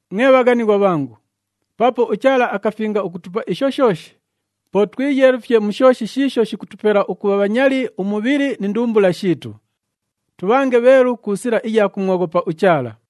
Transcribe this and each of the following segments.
Mwe bhaghanighwa bhangu, paapo uChaala akafinga ukutupa isho shooshi, po twiyeelufye mu shooshi shiisho shikutupela ukubha bhanyali umubhili ni ndumbula shiitu. Tubhange bheelu ku sila iya kumwoghopa uChaala.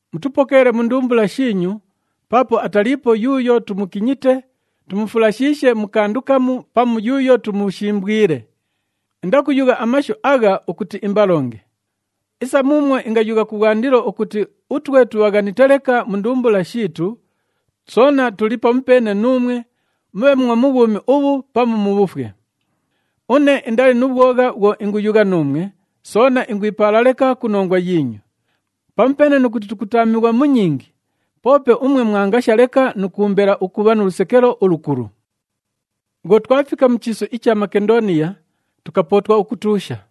Mutupokeele mu ndumbula shiinyu, paapo ataliipo yuuyo tumukinyite, tumufulashiishe mu kandu kamu pamu yuuyo tumushimbwile. Indakuyugha amashu agha ukuti imbalonge. Isa muumwo ingayugha kubhwandilo ukuti utwe tubhaghanite leka mu ndumbula shiitu, soona tuli pamupeene nuumwe, mubhe mwo mu bhwumi ubhu pamu mu bhufwe. Une indali nu bhwogha bhwo inguyugha nuumwe, soona ingwipaala leka ku nongwa yiinyu. Pamupeene nu kuti tukutaamighwa mu nyingi, poope umwe mwangasha leka nu kuumbela ukubha nu lusekelo ulukulu. Bhwo twafika mu chiisu icha Makendooniya, tukapootwa ukutuusha.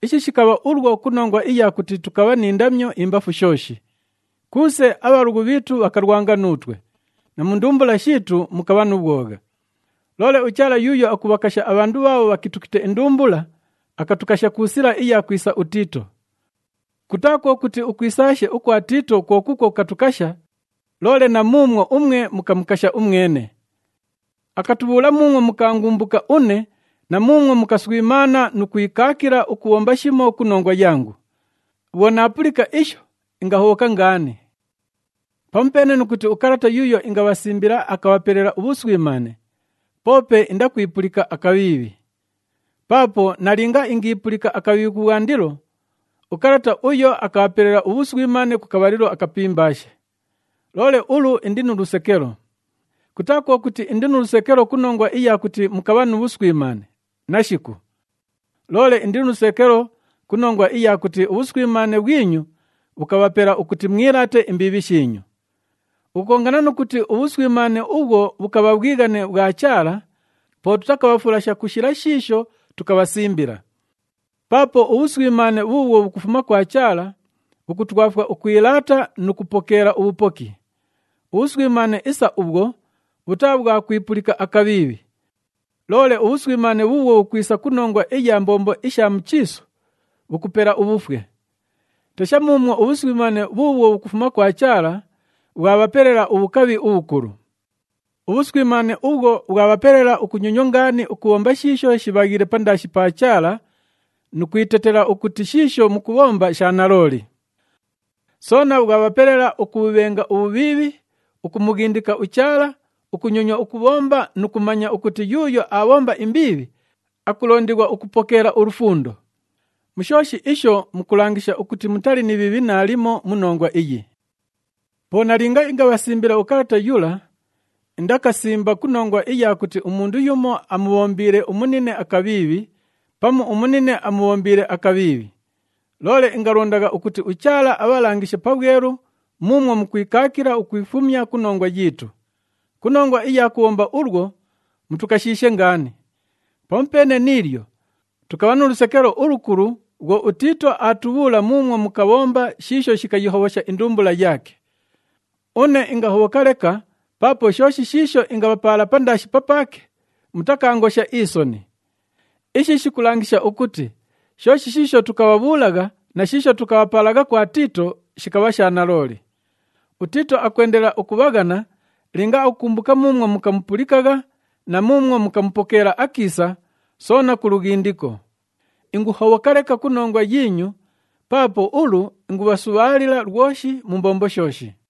Ishi shikabha ulwo ku nongwa iya kuti tukabha ni ndamyo imbafu shooshi. Kuuse, abhalughu bhiitu bhakalwanga nuutwe, na mu ndumbula shiitu mukabha nu bhwogha. Loole uChaala yuuyo akubhakasha abhandu bhaabho bhakitukite indumbula, akatukasha ku sila iya kwisa uTiito. Kutaa kwo kuti ukwisaashe ukwa Tiito kwo kuukwo kukatukasha, loole na muumwo umwe mukamukasha umwene. Akatubhuula muumwo mukaangumbuka une na muumwo mukaswimaana nu kwikaakila ukubhomba shimo ku nongwa yangu. Bhwo naapulika isho, ingahobhoka ngaani. Pamupeene nu kuti ukalata yuuyo ingabhasimbila akabhapelela ubhuswimaane, poope indakwipulika akabhiibhi. Paapo nalinga ingiipulika akabhiibhi kubhwandilo, ukalata uyo akabhapelela ubhuswimaane ku kabhalilo akapimbaashe. Loole ulu indi nu lusekelo. Kutaa kwo kuti indi nu lusekelo ku nongwa iya kuti mukabha nu bhuswimaane, nashiku! Loole indi nu lusekelo ku nongwa iya kuti ubhuswimaane bhwinyu bhukabhapela ukuti mwilaate imbiibhi shiinyu. Ukukongana nu kuti ubhuswimaane ubhwo bhukabha bhwighane bhwa Chaala, po tutakabhafulasha ku shila shiisho tukabhasimbila. Paapo ubhuswimaane bhuubhwo bhukufuma kwa Chaala, bhukutwafwa ukwilaata nu kupokeela ubhupoki. Ubhuswimaane isa ubhwo bhutaa bhwa kwipulika akabhiibhi. Loole ubhuswimaane bhuubhwo bhukwisa ku nongwa iya mbombo isha mu chiisu, bhukupela ubhufwe. Tesha muumwo ubhuswimaane bhuubhwo bhukufuma kwa Chaala, bhwabhapelela ubhukabhi ubhukulu! Ubhuswimaane ubhwo bhwabhapelela ukunyonywa ngaani ukubhomba shiisho shibhaghiile pandaashi pa Chaala nu kwitetela ukuti shiisho mukubhomba sha nalooli. Soona bhwabhapelela ukubhubhenga ubhubhiibhi, ukumughindika uChaala, ukunyonywa ukuumbona nu kumanya ukuti yuuyo aabhomba imbiibhi akulondighwa ukupokeela ulufundo. Mu shooshi isho mukulangisha ukuti mutali ni bhiibhi naalimo mu nongwa iyi. Po nalinga ingabhasimbila ukalata yula, indakasimba ku nongwa iya kuti umundu yumo amubhombiile umunine akabhiibhi, pamu umunine amubhombiile akabhiibhi. Loole ingalondagha ukuti uChaala abhalangishe pabhwelu muumwo mukwikaakila ukwifumya ku nongwa yiitu. Ku nongwa iya kubhomba ulwo, mutukashiishe ngaani. Pamupeene ni ilyo, tukabha nu lusekelo ulukulu bhwo uTiito aatubhuula muumwo mukabhomba shiisho shikayihobhosha indumbula yaake. Une ingahobhoka leka paapo shooshi shiisho ingabhapaala pandaashi papaake, mutakaangosha isoni. Ishi shikulangisha ukuti shooshi shiisho tukabhabhuulagha na shiisho tukabhapaalagha kwa Tiito, shikabha sha nalooli. UTiito akwendelela ukubhaghana linga akukumbuka muumwo mukamupulikagha na muumwo mukamupokeela akiisa, soona ku lughindiko. Inguhobhoka leka ku nongwa yiinyu, paapo ulu ingubhasubhaalila lwoshi mu mbombo shooshi.